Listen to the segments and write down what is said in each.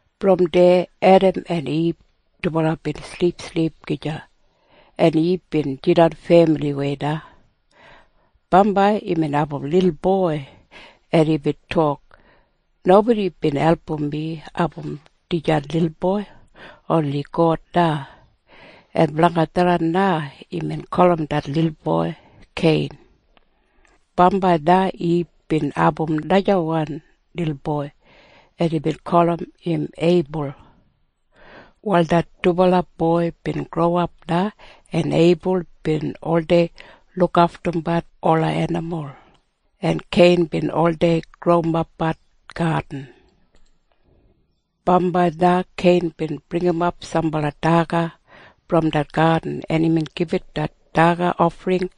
Brom deya Edam en Ib dubala bin silipsilip gija, en Ib bin jidan femiliwei na. Bambai imbin abum lilboi, en imbin tok, “Nobodi bin album mi abum dijan lilboi. Oni God na.” En blanga tharran na imbin gulum det lilboi Kein. Bambai na Ib bin abum najawan lilboi, en imbin gulum im Eibul. Wal det dubala boi bin growap na, en Eibul bin oldei lukaftumbat ola enimul, en Kein bin oldei growimapbat gadin. Bambai na Kein bin bringimap sambala daga brom det gadin, en imbin gibit det daga ofring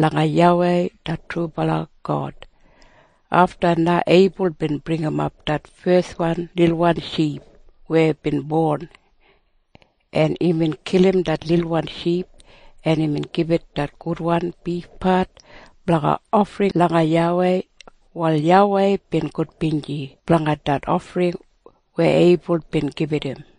langa YAWEI det trubala God. Afta na Eibul bin bringimap det feswan lilwan ship weya bin bon, en imbin kilim det lilwan ship, en imbin gibit det gudwan bifpat blanga ofring langa YAWEI. Wal YAWEI bin gudbinji blanga det ofring weya Eibul bin gibit im.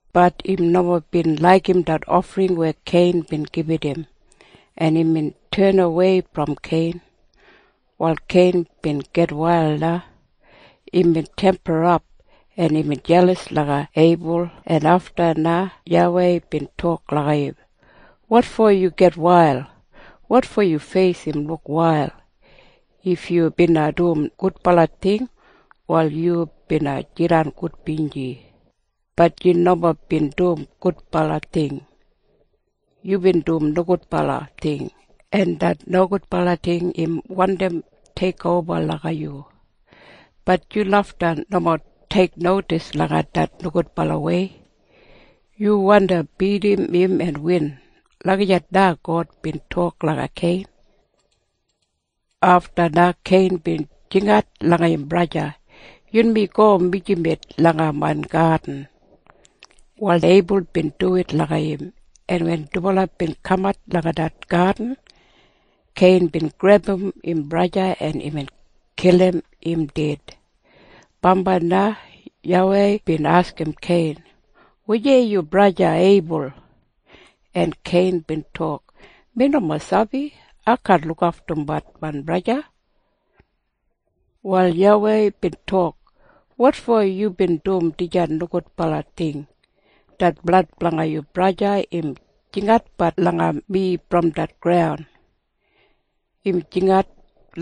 Bat im nomo bin laigim det ofring weya Kein bin gibit im, en imbin tenawei brom Kein. Wal Kein bin gitwail na. Imbin temperap, en imbin jelas langa Eibul en afta na YAWEI bin tok langa im, “Wotfo yu gitwail? Wotfo yu feis im luk wail? If yu bina dum gudbala ting, wal yu bina jidan gudbinji. Bat yu nomo bin dum gudbala ting. Yubin dum nogudbala ting. En det nogudbala ting im wandi teikoba langa yu. Bat yu lafta nomo teiknodis langa det nogudbalawei. Yu wandi bidim im en win.” Lagijat na God bin tok langa Kein. Afta na Kein bin jingat langa im braja, “Yunmi go mijamet langa main gadin.” Wal Eibul bin duwit langa im, en wen dubala bin kamat langa det gadin, Kein bin grebum im braja, en imbin kilim im ded. Bambai na YAWEI bin askim Kein, “Wujei yu braja Eibul?” En Kein bin tok, “Mi nomo sabi. Ai kaan lukaftumbat main braja.” Wal YAWEI bin tok, “Wotfo yubin dum dijan nogudbala ting? Det blad blanga yu braja im jinginatbat langa mi brom det graun. Im jinginat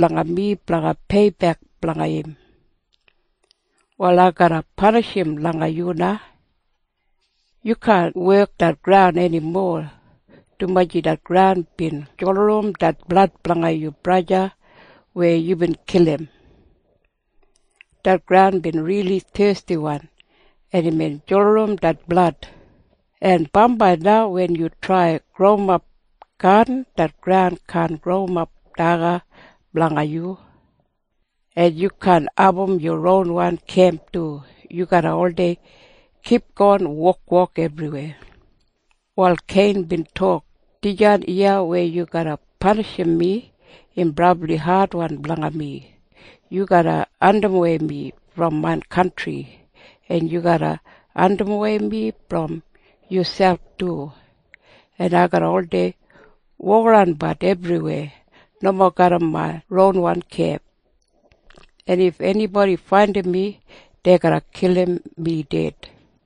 langa mi blanga peibek blanga im. Wal ai garra panishim langa yu na. Yu kaan wekim det graun enimo, dumaji det graun bin julurum det blad blanga yu braja weya yubin kilim. Det graun bin rili thestiwan, en imbin julurum det blad, en bambai na wen yu trai growimap gadin, det graun kaan growimap daga blanga yu. En yu kaan abum yu ronwan kemp du. Yu garra oldei kipgon wokwok ebriwei.” Wal Kein bin tok, “Dijan iya weya yu garra panishim mi, im brabli adwan blanga mi. Yu garra andimwei mi brom main kantri, en yu garra andimwei mi brom yuselp du, en ai garra oldei wokaranbat ebriweya nomo garram main ronwan kemp. En if enibodi faindim mi, dei garra kilim mi ded.”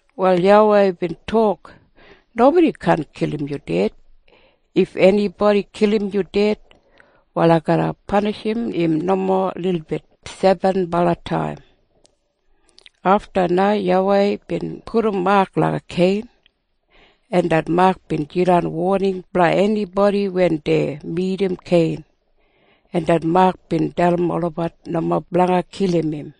Wal YAWEI bin tok, “Nobodi kaan kilim yu ded. If enibodi kilim yu ded, wal sebenbala pipul garra dai blanga peibek blanga yu.” Afta na YAWEI bin pudum mak langa Kein, en det mak bin jidan woning blanga enibodi wen dei midim Kein, en det mak bin dalim olabat nomo blanga kilim im.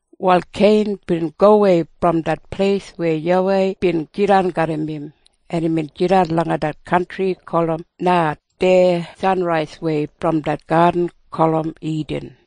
Wal Kein bin gowei brom det pleis weya YAWEI bin jidan garram im, en imbin jidan langa det kantri gulum Nad deya sanraiswei brom det gadin gulum Idin.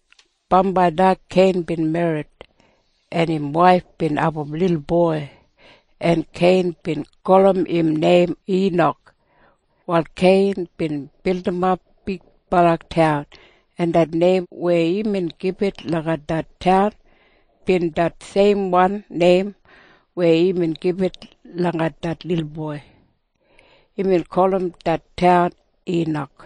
Bambai na Kein bin merrit, en im waif bin abum lilboi, en Kein bin gulum im neim Inak. Wal Kein bin bildimap bigbala taun, en det neim weya imbin gibit langa det taun bin det seimwan neim weya imbin gibit langa det lilboi. Imbin gulum det taun Inak.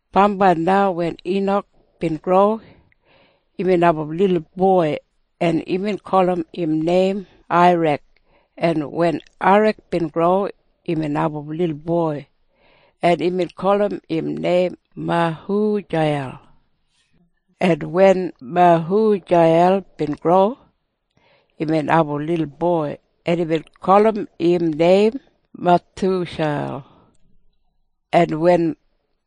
Bambai na wen Inak bin gro, imbin abum lilboi, en imbin gulum im neim Airad. En wen Airad bin gro, imbin abum lilboi, en imbin gulum im neim Mehujeiyel. En wen Mehujeiyel bin gro, imbin abum lilboi, en imbin gulum im neim Mathusheil. En wen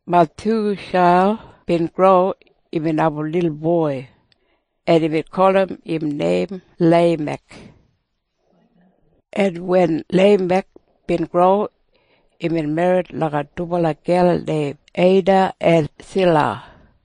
Mathusheil bin gro, imbin abum lilboi, en imbin gulum im neim Leimek. En wen Leimek bin gro, imbin merrit langa dubala gel neim Eda en Sila.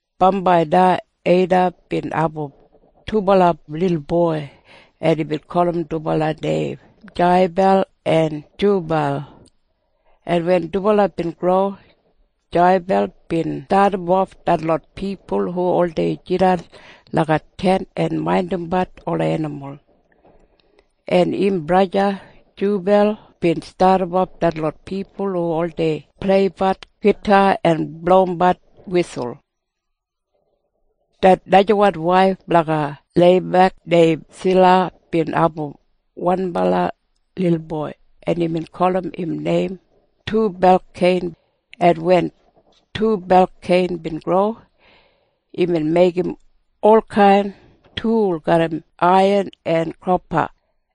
Bambai na Eda bin abum dubala lilboi, en imbin gulum dubala neim Jeibal en Jubal. En wen dubala bin gro, Jeibal bin stadimof detlot pipul hu oldei jidan langa tent en maindimbat ola enimul, en im braja Jubal bin stadimof detlot pipul hu oldei pleibat gita en blowimbat wisul. Det najawan waif blanga Leimek neim Sila bin abum wanbala lilboi, en imbin gulum im neim Tubalkein. En wen Tubalkein bin gro, imbin meigim olkain tul garram aiyan en kopa,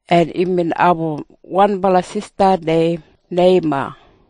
en imbin abum wanbala sista neim Neima.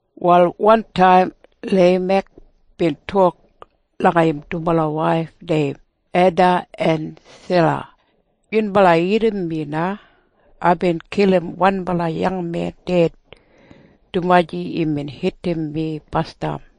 Wal wantaim Leimek bin tok langa im dubala waif neim Eda en Sila, “Yunbala irrim mi na. Aibin kilim wanbala yangmen ded dumaji imbin hitim mi basdam.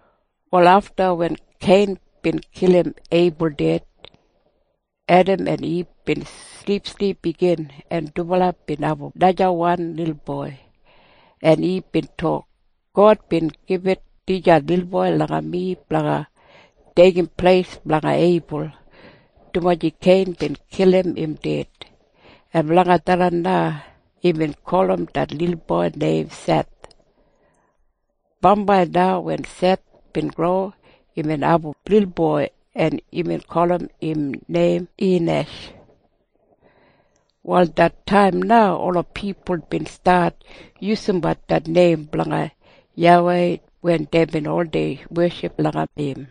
Wal afta wen Kein bin kilim Eibul ded, Edam en Ib bin silipsilip igin, en dubala bin abum najawan lilboi, en Ib bin tok, “God bin gibit dijan lilboi langa mi blanga deigim pleis blanga Eibul, dumaji Kein bin kilim im ded.” En blanga tharran na imbin gulum det lilboi neim Seth. Bambai na wen Seth bin gro, imbin abum lilboi, en imbin gulum im neim Inash. Wal det taim na ola pipul bin stat yusumbat det neim blanga YAWEI wen deibin oldei weship langa im.